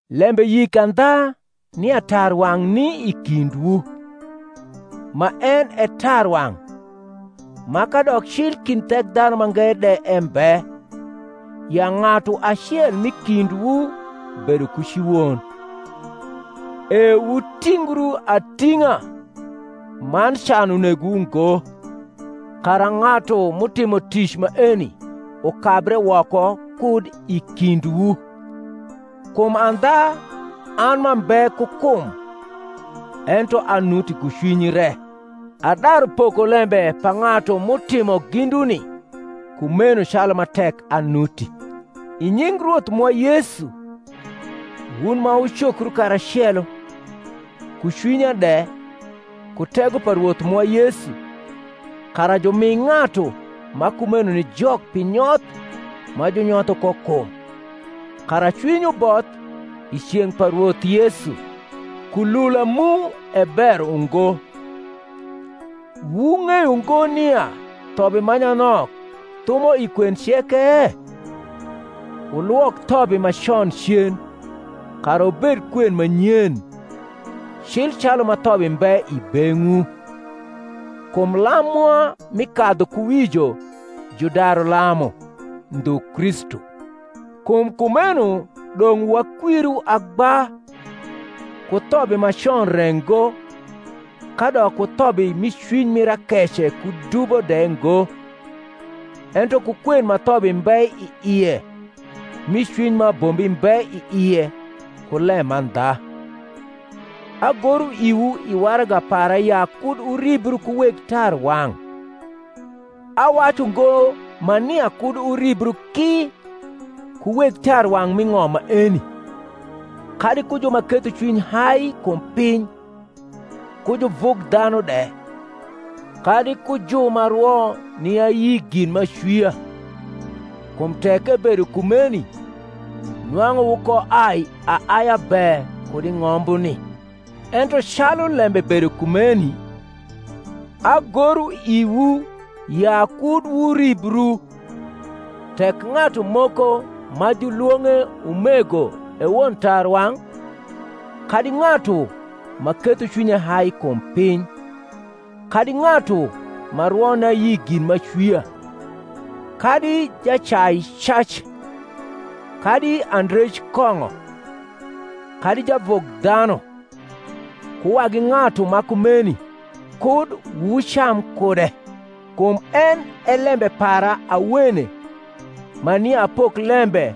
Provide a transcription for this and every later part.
Lembe yik andha nia tarwang’ ni i kindwu, ma en e tarwang’, ma kadok cli kind Thekdhanumange de embe, ya ng’atu acel m’i kindwu bedo ku ci won. E wutingru ating’a, man can unegowu ngo, kara ng’atu m’utimo tic maeni ukabre woko kud i kindwu. Kum andha, an m’ambe ku kum ento anuti ku cwiny re, adaru poko lembe pa ng’atu m’utimo ginduni kumeno calu ma tek anuti, i nying Rwoth mwa Yesu, wun ma wucokru karacelo, ku cwinya de, ku tego pa Rwoth mwa Yesu, kara jumi ng’atu ma kumeno ni Jok pi nyoth ma junyotho ko kum, kara cwiny uboth i ceng’ pa Rwoth Yesu. Kulula mu e ber ungo. Wung’eyo ngo nia thobi ma nyanok thumo i kwen ceke? Wulwok thobi ma con cen, kara wubed kwen ma nyen, cil calu ma thobi mbe i beng’wu. Kum lam mwa mi kadhukuwijo judaru lamu, ndhu Kristu: kum kumeno dong’ wakwiru agba, ku thobi ma con re ngo, kadok ku thobi mi cwiny mir akece ku dubo de ngo, ento ku kwen ma thobi mbe i ie mi cwiny ma abombi mbe i ie ku lemandha. Agoro iwu i waraga para ya kud wuribru ku weg tarwang’; awacu ngo ma nia kud wuribru ki ku weg tarwang’ m’i ng’om maeni, kadi ku ju ma ketho cwiny hai kum piny ku juvugdhanu de, kadi ku ju ma rwo ni ayi gin m’acwia, kum tek ebedo kumeni nwang’u wukoai aaia be kud i ng’ombuni: ento calu lembe bedo kumeni, agoro iwu ya kud wuribru, tek ng’atu moko ma julwong’e umego e won tarwang’, kadi ng’atu ma ketho cwinye hai kum piny, kadi ng’atu ma rwo ni ayi gin m’acwia, kadi jacai cac, kadi andrej kong’o, kadi javugdhanu; ku wagi ng’atu ma kumeni, kud wucam kude. Kum en e lembe para awene ma nia apok lembe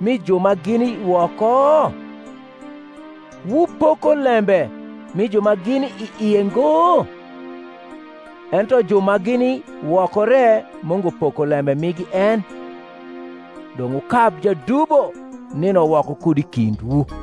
mi ju ma gini woko? Wupoko lembe mi ju ma gini i ie ngo? Ento ju ma gini woko re Mungu poko lembe migi en. Dong’ wukab jadubo nino woko kud i kindwu.